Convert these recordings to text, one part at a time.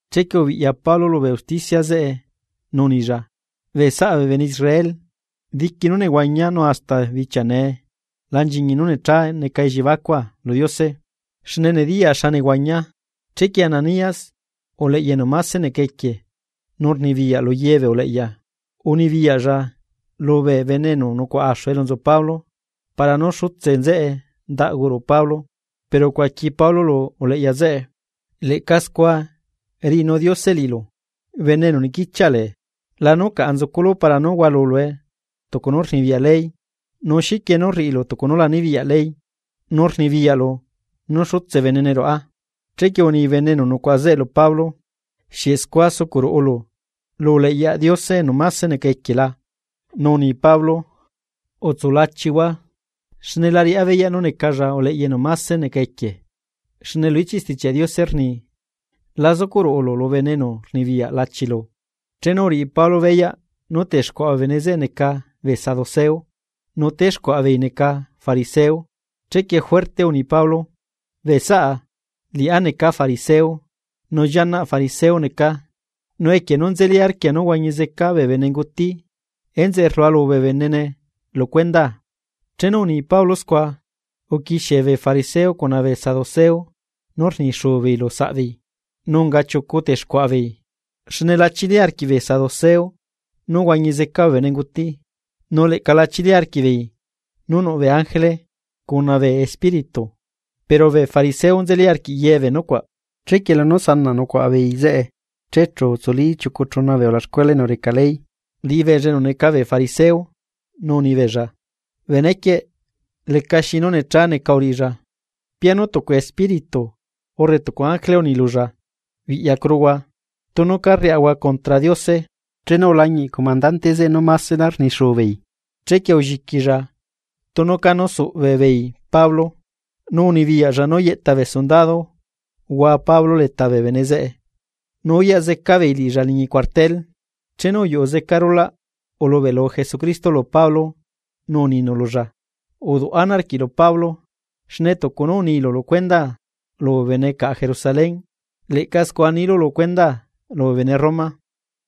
Chequie ubiꞌya Pablo lubee usticia zeꞌe nu unilla: ―Bee saꞌa bee bene Israel, diqui nú nehuañia nu hasta bichia nee la nchiñi nú necha neca elliebacua lu Diose, xne nediyaa xa nehuañia. Chequie Ananías, uleꞌya enu mase neca equie nu rnibiyaꞌ lu ye bee uleꞌya, unibiyaꞌlla lubee enu nucuaꞌa axu elu nzu Pablo para nú xutse nzeꞌe ndaꞌgu ruꞌu Pablo. Pero ucuaqui Pablo lu uleꞌya zeꞌe: ―¡Leꞌca scua riꞌinu Diose liꞌilu, bene enu niquichiaꞌ le! ¿Lanu caꞌa nzuculu para nú hualulue tucu nú rnibiyaꞌ ley? Nu, ¿xiquie nú rriꞌilu tucu nú la nibiyaꞌ ley, nu rnibiyaꞌlu nú xutse benene ruꞌa? Chequie uni bee bene enu nucuaꞌa zeꞌe lu Pablo: ―¿Xieꞌ scua sucuꞌ ruꞌulu lu uleꞌyaꞌ Diose enu máse neca equie la? Nu uni Pablo: ―Utsulachihua xne la riꞌá beyaꞌ nú necalla uleꞌya enu máse neca equie. Xne lu ichiꞌ Stichiaꞌ Diose rni: “La zucuꞌ ruꞌulu lu bene enu rnibiyaꞌ lachilu.” Chenu uriꞌi Pablo beyaꞌ nú texcuaꞌa bee bene zeꞌe neca bee saduceo, nu texcuaꞌa beei neca fariseo, chequie juerte uni Pablo: ―Bee saꞌa, liꞌá neca fariseo, nu llianaꞌ fariseo necaa. Nu equie nú nzeli arquia nú huañi zeca bee benenguti enzeꞌe rlualu bee benene lu cuendaa. Chenu uni Pablo scua, uquixie bee fariseo cuna bee saduceo nú rnixuu beei lu saꞌbeei, nu unga chiucu texcuaꞌa beei. Xne la chili arquiꞌ bee saduceo nú huañi zeca bee benenguti, nu leꞌca la chili arquiꞌbeei nú nuꞌ bee ángele, cuna bee espíritu, pero bee fariseo nzeli arquiꞌ ye bee nucuaꞌ. Chequie lunú sanaꞌ nucuaꞌa beei zeꞌe. Che chu utsuli chiucu chuna bee ulaxcuela enu reca ley, liꞌibeella enu neca bee fariseo, nu unibeella: ―Benequieꞌ lecaxi nú necha neca uriꞌilla, pianu tucu espíritu urre tucu ángele unilulla, biꞌyacuruhua tunu ca rriꞌahua condra Diose. Chenu ulañiꞌ comandante zeꞌe nú másela rni xuubeei, chequie ulliquilla tunu cá suꞌbe beei Pablo. Nu unibiyaꞌlla nú yeꞌta bee sundado hua Pablo leta bee bene zeꞌe nu uyaꞌ zeca beei liꞌilla liñi cuartel. Chenu uyuꞌu rulaꞌ stucu bichia rulaꞌ, ulubeꞌlu Jesucristo lu Pablo nu uninu lulla: ―Uduꞌ ana arquiꞌlu Pablo, xne tucu nú unilu lu cuendaa lubee bene caꞌa Jerusalén, leꞌca scua nilu lu cuendaa lubee bene Roma.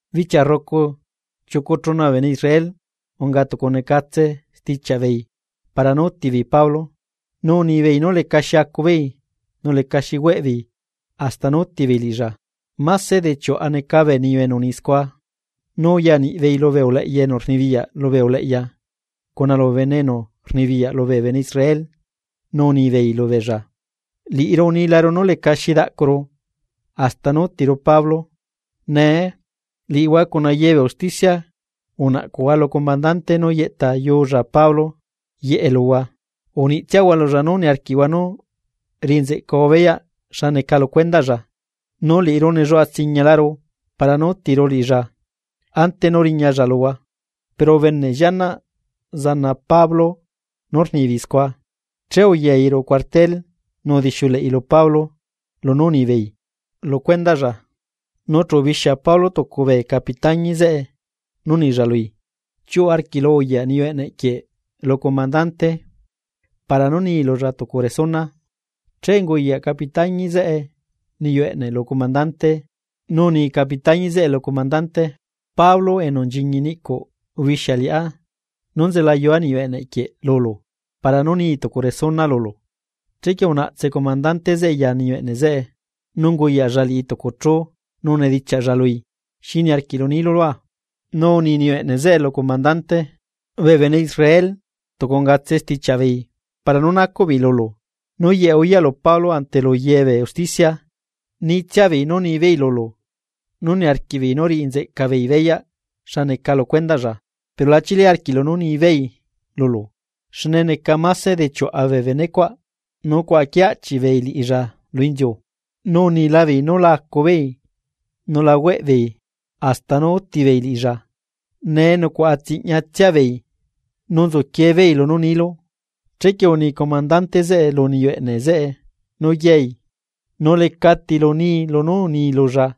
Bichia rrucu, chiucu chuna bee bene Israel unga tucu ungatse stichiaꞌ beei para nú útibeei Pablo, nu unibeei nú lecaxi acubeei nu lecaxi hueꞌbeei hasta nú útibeei liꞌilla. Máse de chiuꞌa neca bee niyu enu uni scua. Nu uyaniꞌbeei lubee uleꞌya enu rnibiyaꞌ lubee uleꞌya cuna lubee bene enu rnibiyaꞌ lubee bene Israel, nu unibeei lubeella: ―Liꞌiru unilaru nú lecalí xi daꞌcuru hasta nú útiru Pablo. Nee, liꞌihua cuna ye bee usticia unaꞌcuꞌhua lu comandante nú yeꞌtayuulla Pablo yeꞌe luhua, uniꞌtsiahua lulla nú niarquiꞌhua nú riꞌi nzeꞌcahua beyaꞌ xa neca lu cuendaꞌlla. Nu liꞌiru nelluaꞌa tsiñalaru para nú útiru liꞌilla ante nú riñalla luhua. Pero ubeneꞌ llianaꞌ zana Pablo nú rnibeei scua, che uyai ruꞌu cuartel nu udixiuleꞌi lu Pablo lunú unibeei lu cuendaꞌlla. Nu chu ubixia Pablo tucu bee capitañi zeꞌe nu unilla lui: ―Chiuꞌu arquiꞌlu uyaꞌ niyu eꞌneꞌ quieꞌ lu comandante para nú nii lulla tucu resuna. Che unguyaꞌ capitañi zeꞌe niyu eꞌneꞌ lu comandante nu uni capitañi zeꞌe lulla: ―Pablo enu nchiñi niꞌcuꞌ ubixia liꞌá nú nzelayua niyu eꞌneꞌ quieꞌ lulu para nú nii lulu tucu resuna. Chequie unaꞌtse comandante zeꞌe ya niyu eꞌne zeꞌe, nu unguyaꞌlla liꞌi tucu chú nu unidichiaꞌlla lui: ―¿Xi niarquiꞌlu niilu lua? Nu uni niyu eꞌneꞌ zeꞌe lu comandante: ―Bee bene Israel tucu ungatse stichiaꞌ beei para nú nacuꞌ beei lulu nú yeꞌe uyaꞌlu Pablo ante lu ye bee usticia, nitsiabeei lulu nú niarquiꞌbeei nú riꞌi nzeꞌca beei beyaꞌ xa neca lu cuendaꞌlla. Pero la chili arquiꞌlu nú nibeei lulu, xne máse de chiuꞌa bee benecuaꞌ cuaꞌa quiee aꞌchiꞌ beei liꞌilla lu inziu, nu uniila beei nú la acu beei nu la hueꞌ beei hasta nú úti beei liꞌilla. Nee, nucuaꞌa tsiñatsia beei nu nzuquiee beei lunú nilu. Chequie uni comandante zeꞌe lu niyu eꞌneꞌ zeꞌe nú yai, nu leca tilu nii lunú unii lulla.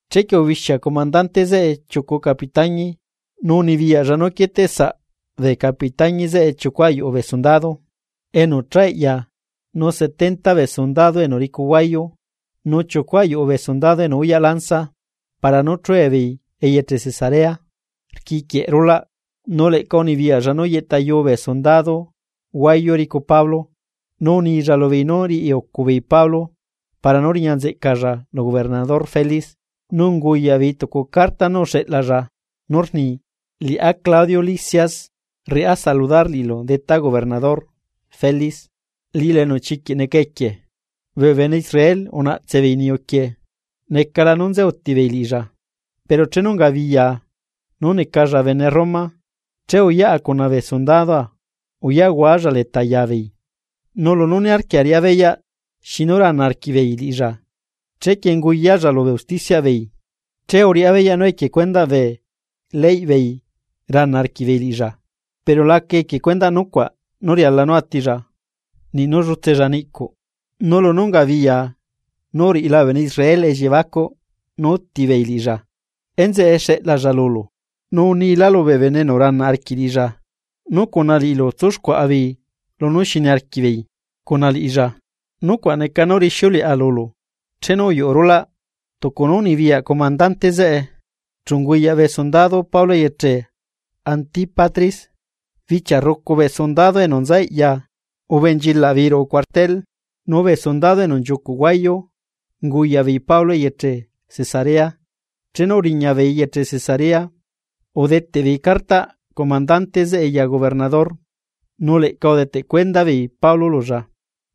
Chequie ubixia comandante zeꞌe chiucu capitañi, nu unibiyaꞌlla nú quieteꞌsaꞌ bee capitañi zeꞌe chiucu ayuꞌu bee sundado enu cha eꞌya nu setenta bee sundado enu ricu huayu nu chiucu ayuꞌu bee sundado enu uyaꞌ lanza para nú chue beei eyeche Cesarea rquiquieꞌ rulaꞌ. Nu leꞌca unibiyaꞌlla nú yeꞌtayuu bee sundado huayu ricu Pablo, nu unilla lubeei nú riꞌi ucu beei Pablo para nú riña nzeꞌcalla lu gobernador Félix. Nu unguyaꞌ beei tucu carta nú uxeꞌlalla nú rni: “Liꞌá Claudio Lisias, riꞌá saludar liꞌilu detá gobernador Félix, liꞌilu enu chiquiꞌ neca equie. Bee bene Israel unaꞌtse beei niyuquieꞌ, necala nú nze utibeei liꞌilla, pero chenu ungabiyaa nú necalla bene Roma, che uyaꞌa cuna bee sundadoa uyaꞌhualla leta yabeei. Nu lunú niarquia riꞌá beyaꞌ xinu rana arquiꞌbeei liꞌilla, chequie unguyalla lubee usticiaꞌ beei, che uriꞌá beyaꞌ nú equie cuendaꞌ bee leyꞌ beei rana arquiꞌbeei liꞌilla, pero laca equie nucuaꞌ nú riala nú atilla, niꞌ nú llutsella niꞌcuꞌ. Nu lunú ungabiyaa nú uriꞌila bee bene Israel elliebacuꞌ nú útibeei liꞌilla, enzeꞌe xeꞌlalla lulu, nu unila lubee bene enu rana arquiꞌ liꞌilla nú cuna liꞌilu tsúxcuaꞌa beei lunú xi niarquiꞌ beei cuna liꞌilla. Nucuaꞌ neca nú rixiuleꞌa lulu.” Chenu uyuꞌu rulaꞌ, tucu nú unibiyaꞌ comandante zeꞌe, chu unguyaꞌ bee sundado Pablo eyeche Antípatris. Bichia rrucu bee sundado enu nza eꞌya ubenchilaꞌbeei ruꞌu cuartel, nu bee sundado enu nchiucuꞌ huayu unguyaꞌbeei Pablo eyeche Cesarea. Chenu uriña beei eyeche Cesarea, udeteꞌbeei cartaꞌ comandante zeꞌe ya gobernador, nu leꞌca udeteꞌ cuenda beei Pablo lulla.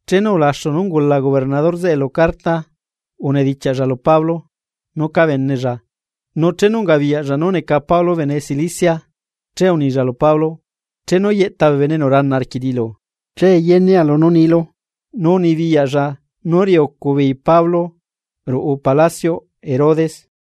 Chenu ulaxu nú ungula gobernador zeꞌe lu carta, unedichiaꞌlla lu Pablo nú cábenella. Nu chenu ungabiyaꞌlla nú neca Pablo bene Cilicia, che unilla lu Pablo: ―Chenu yeꞌta bee bene enu rana arquiꞌ liꞌilu, che yenea lunú nilu. Nu unibiyaꞌlla nú riꞌiucubeei Pablo ruꞌu palacioꞌ Herodes.